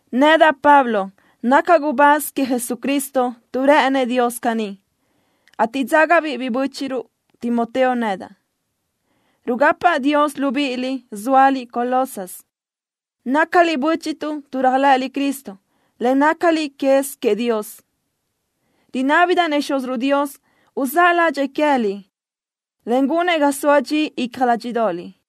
Nedaʼ, Pablo, nacaʼ gubáz queëʼ Jesucristo tuʼ rë́ʼënëʼ Dios caní, ateʼ dzágabiʼ biʼi bö́chiʼruʼ Timoteo nedaʼ. Rugapaʼ Dios libíʼiliʼ, zóaliʼ Colosas. Nácaliʼ bö́chiʼtuʼ réajlëʼëliʼ Cristo, en nácaliʼ quez queëʼ Dios. Rinábidaʼ-nëʼ Xúziruʼ Dios uzáʼ ládxëʼë queë́liʼ, en gunëʼ ga soa dxi icja ládxiʼdoʼoliʼ.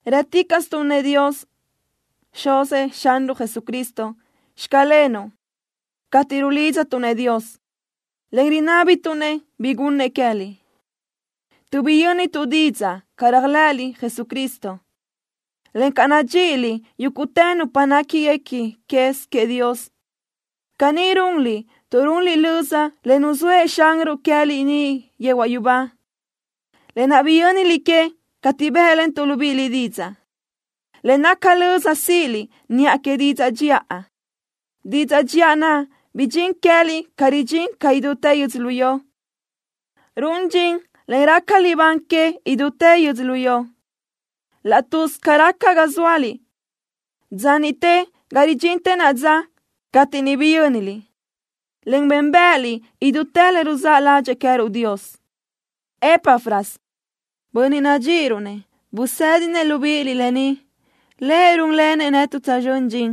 Rë́ticaʼstuʼ-nëʼ Dios, Xuzëʼ Xanruʼ Jesucristo: “Xclenuʼ” cateʼ rulidztuʼ-nëʼ Dios, en rinábituʼ-nëʼ bi gunëʼ queë́liʼ tuʼ biyö́nituʼ didzaʼ ca réajlëʼëliʼ Jesucristo, en ca nadxíʼiliʼ yúguʼtë nupa néquiguequi quez queëʼ Dios. Caní runliʼ tuʼ runliʼ löza le nuzóëʼ Xanruʼ queë́liʼ niʼ yehuaʼ yubá, lë naʼ biyö́niliʼ que cateʼ bë́ʼlentuʼ libíʼiliʼ didzaʼ, le naca löza síʼiliʼ niʼa que didzaʼ dxiʼa. Didzaʼ dxiʼa naʼ bidxín queë́liʼ ca ridxín caʼ idútë yödzölió. Run dxin, en raca libán que, idútë yödzölió, laʼ tuz ca raca ga zóaliʼ, dza niʼte ga ridxintë naʼa dza, cateʼ niʼ biyö́niliʼ, en bénbëʼëliʼ idútë le ruzáʼ ládxëʼë queë́ruʼ Dios. Epafras, bönniʼ nadxíʼiruʼ-nëʼ, busë́dinëʼ libíʼiliʼ lë ni. Lëʼ rúnlenëʼ netuʼ tsözxö́n dxin,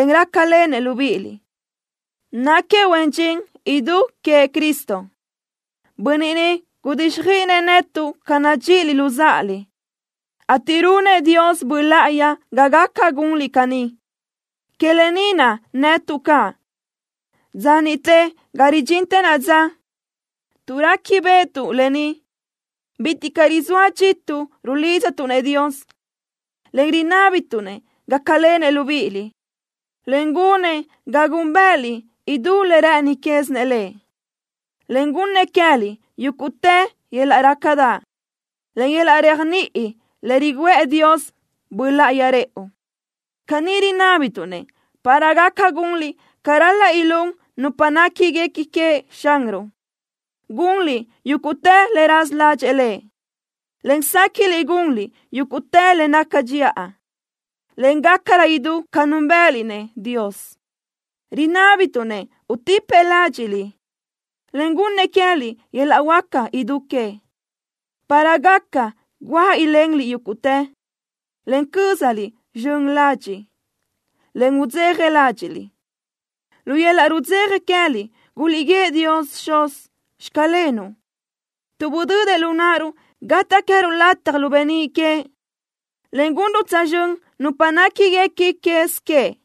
en rácalenëʼ libíʼiliʼ. Náquiëʼ huen dxin idú queëʼ Cristo. Bönniʼ ni gudíxjöiʼinëʼ netuʼ ca nadxíʼiliʼ luzáʼaliʼ, ateʼ runëʼ Dios Böʼ Láʼayi ga gaca gunliʼ caní. Que lë ni naʼ netuʼ caʼ, dza niʼte ga ridxintë naʼa dza, tuʼ réquibeʼetuʼ lë ni, bitiʼ caʼ rizóa dxituʼ rulidztuʼ-nëʼ Dios, en rinábituʼ-nëʼ gácalenëʼ libíʼiliʼ, en gunëʼ ga gúnbëʼëliʼ idú le rë́ʼëni quézinëʼ Lëʼ, en gunnëʼ queë́liʼ yúguʼtë yöl-laʼ rácadaʼ, en yöl-laʼ réajniʼi le riguʼë Dios Böʼ Láʼayi rëʼu. Caní rinábituʼ-nëʼ para gaca gunliʼ ca ral-laʼ ilún nupa néquiguequi queëʼ Xanruʼ, gunliʼ yúguʼtë le raza ládxëʼë Lëʼ, en séquiʼliʼ gunliʼ yúguʼtë le naca dxiʼa, en gácarö idú ca núnbëʼëliʼ-nëʼ Dios. Rinábituʼ-nëʼ utipëʼ ládxiʼliʼ, en gunnëʼ queë́liʼ yöl-laʼ huáca idú queëʼ, para gaca guáʼ ilenliʼ yúguʼtë, en cö́zaliʼ zxön ladxiʼ, en udzeja ládxiʼliʼ. Lu yöl-laʼ rudzeja queë́liʼ guliʼguíëʼ Dios Xuz: “Xclenuʼ”, tuʼ budödëʼ lu náʼaruʼ gataʼ queë́ruʼ lataj lu beníʼ queëʼ, en gunruʼ tsözxö́n nupa néquiguequi quez queëʼ.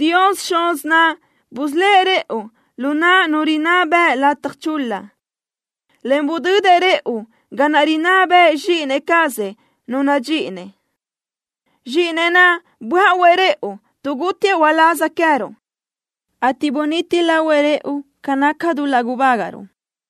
Dios Xuz naʼ busölë́ʼ rëʼu lu naʼ nu rinná bëʼ lataj chul-la, en budödëʼ rëʼu ga naʼ rinná bëʼë Zxíʼini cazëʼ, Nu nadxíʼinëʼ. Zxíʼinëʼ naʼ böáʼuëʼ rëʼu, tuʼ gútiëʼ uláz queë́ruʼ, ateʼ buniti lahuëʼ rëʼu ca naca dul-laʼ gubágaʼruʼ.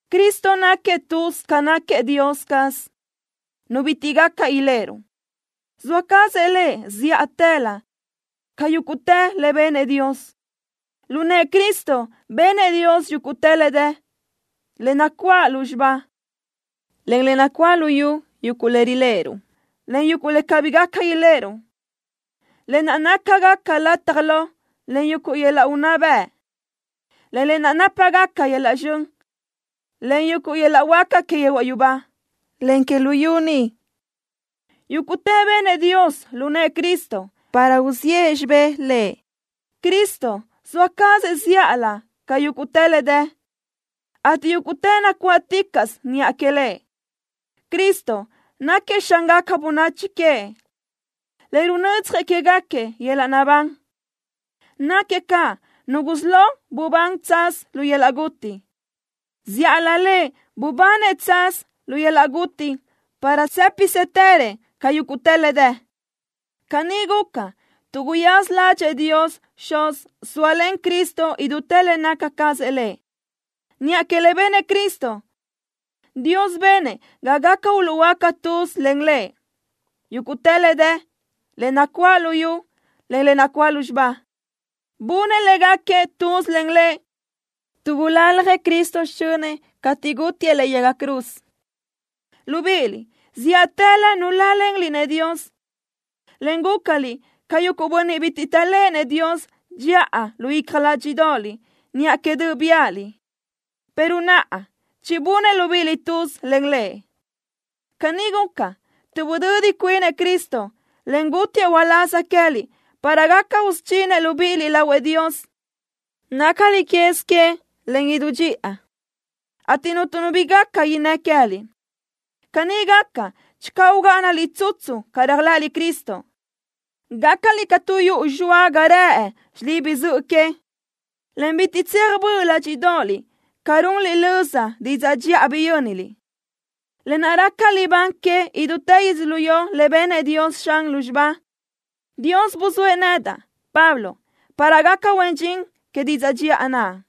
Cristo náquiëʼ tuz ca náquiëʼ Dios caz, Nu bitiʼ gaca iléʼeruʼ. Zoa cazëʼ Lëʼ zíʼatëlö ca yúguʼtë le benëʼ Dios. Lu nëʼë Cristo benëʼ Dios yúguʼtë le dë, le nacuáʼ lúzxiba, en le nacuáʼ luyú, yuguʼ le riléʼeruʼ, en yuguʼ le cabí gaca iléʼeruʼ, lë naʼ nácagaca lataj lo, en yuguʼ yöl-laʼ unná bëʼ, en le nápagaca yöl-laʼ zxön, en yuguʼ yöl-laʼ huáca que yehuaʼ yubá, en que luyú ni. Yúguʼtë benëʼ Dios lu nëʼë Cristo para uziʼë xibé Lëʼ. Cristo zoa cazëʼ zíʼalö ca yúguʼtë le dë, ateʼ yúguʼtë nacuáʼticaʼsö niʼa queëʼ Lëʼ. Cristo náquiëʼ Xángaca bönachi queëʼ, en runödzjëʼ quégaquiëʼ yöl-laʼ naʼbán. Náquiëʼ caʼ Nu gusí lo bubán tsaz lu yöl-laʼ guti. Zíʼalö Lëʼ bubanëʼ tsaz lu yöl-laʼ guti para tsë́pisëtërëʼ ca yúguʼtë le dë. Caní guca, tuʼ guyaza ládxëʼë Dios Xuz sóalen Cristo idútë le naca cazëʼ Lëʼ. Niʼa que le benëʼ Cristo, Dios benëʼ ga gaca uluʼhuöáca tuz len Lëʼ yúguʼtë le dë, le nacuáʼ luyú, en le nacuáʼ lúzxiba. Bunëʼ léguequi tuz len Lëʼ tuʼ bulaljëʼ Cristo xichönëʼ cateʼ gútiëʼ lëʼe yaga cruz. Libíʼiliʼ, zíʼatëlö nuláʼalenliʼ-nëʼ Dios, en gúcaliʼ ca yuguʼ bönniʼ bitiʼ taʼléʼenëʼ Dios dxiʼa lu icja ládxiʼdoʼoliʼ niʼa que döʼ biáʼaliʼ, pero naʼa chibunëʼ libíʼiliʼ tuz len Lëʼ. Caní guca, tuʼ budödi cuinëʼ Cristo, en gútiëʼ uláz queë́liʼ para gaca usudxinëʼ libíʼiliʼ lahuëʼ Dios, nácaliʼ quez queëʼ, en idú dxiʼa, ateʼ cuntu nu bi gaca innë́ queë́liʼ. Caní gaca channö ugáʼanaliʼ tsutsu ca réajlëʼëliʼ Cristo. Gácaliʼ ca tu yuʼu zxoa ga rëʼ xilibi zöʼö que, en bitiʼ tseaj böʼ ládxiʼdoʼoliʼ ca runliʼ löza didzaʼ dxiʼa biyö́niliʼ, lë naʼ raca libán que idútë yödzölió le benëʼ Dios zxan lúzxiba. Dios buzóëʼ nedaʼ, Pablo, para gacaʼ huen dxin que didzaʼ dxiʼa naʼ.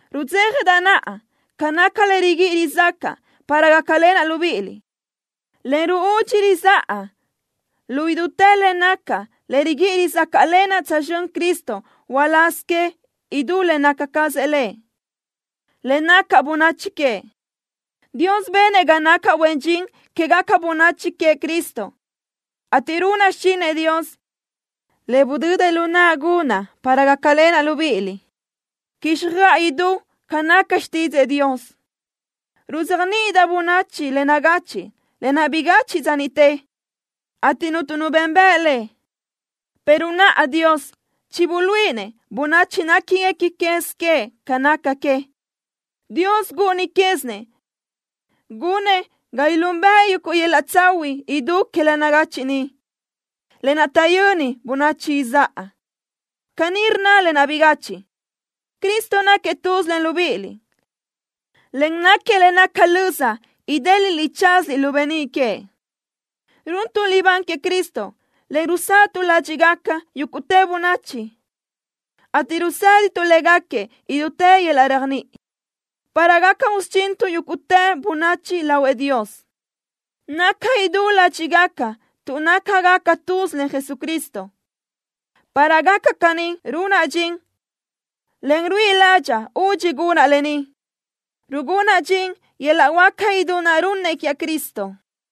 Rudzéjadaʼ naʼa ca naca le riguíʼi rizácaʼa para gácalenaʼ libíʼiliʼ, en ruúdxi rizáʼa lu idútë le nacaʼ le riguíʼi rizácaʼlenaʼ tsözxö́n Cristo uláz que idú le naca cazëʼ Lëʼ, le naca bönachi queëʼ. Dios benëʼ ga nacaʼ huen dxin quégaca bönachi queëʼ Cristo, ateʼ runaʼ xichinëʼ Dios, le budödëʼ lu naʼa gunaʼ para gácalenaʼ libíʼiliʼ, quíxjöʼa idú ca naca xtídzëʼë Dios. Ruzéajniʼidaʼ bönachi le nagachiʼ, lë naʼ bigachiʼ dza niʼte, ateʼ cuntu nu benbëʼ le, pero naʼa Dios chibuluíʼinëʼ bönachi néquiguequi quez queëʼ ca naca que. Dios gúʼuni quézinëʼ gunëʼ ga ilúnbëʼe yuguʼ yöl-laʼ tsahuiʼ idú que le nagachiʼ ni, lë naʼ taʼyöni bönachi izáʼa. Caní rnna lë naʼ bigachiʼ: “Cristo náquiëʼ tuz len libíʼiliʼ, en náquiëʼ le naca löza idéliʼliʼ tsazliʼ lu beníʼ queëʼ.” Runtuʼ libán queëʼ Cristo, en rusáʼatuʼ ládxiʼgaca yúguʼtë bönachi, ateʼ rusë́dituʼ léguequi idútë yöl-laʼ réajniʼi, para gaca usudxintuʼ yúguʼtë bönachi lahuëʼ Dios, naca idú ládxiʼgaca tuʼ nácagaca tuz len Jesucristo. Para gaca caní runaʼ dxin, en ruíʼi ládxaʼa údxi gunaʼ lë ni, rugúnaʼ dxin yöl-laʼ huáca idú naʼ runnëʼ Cristo quiaʼ.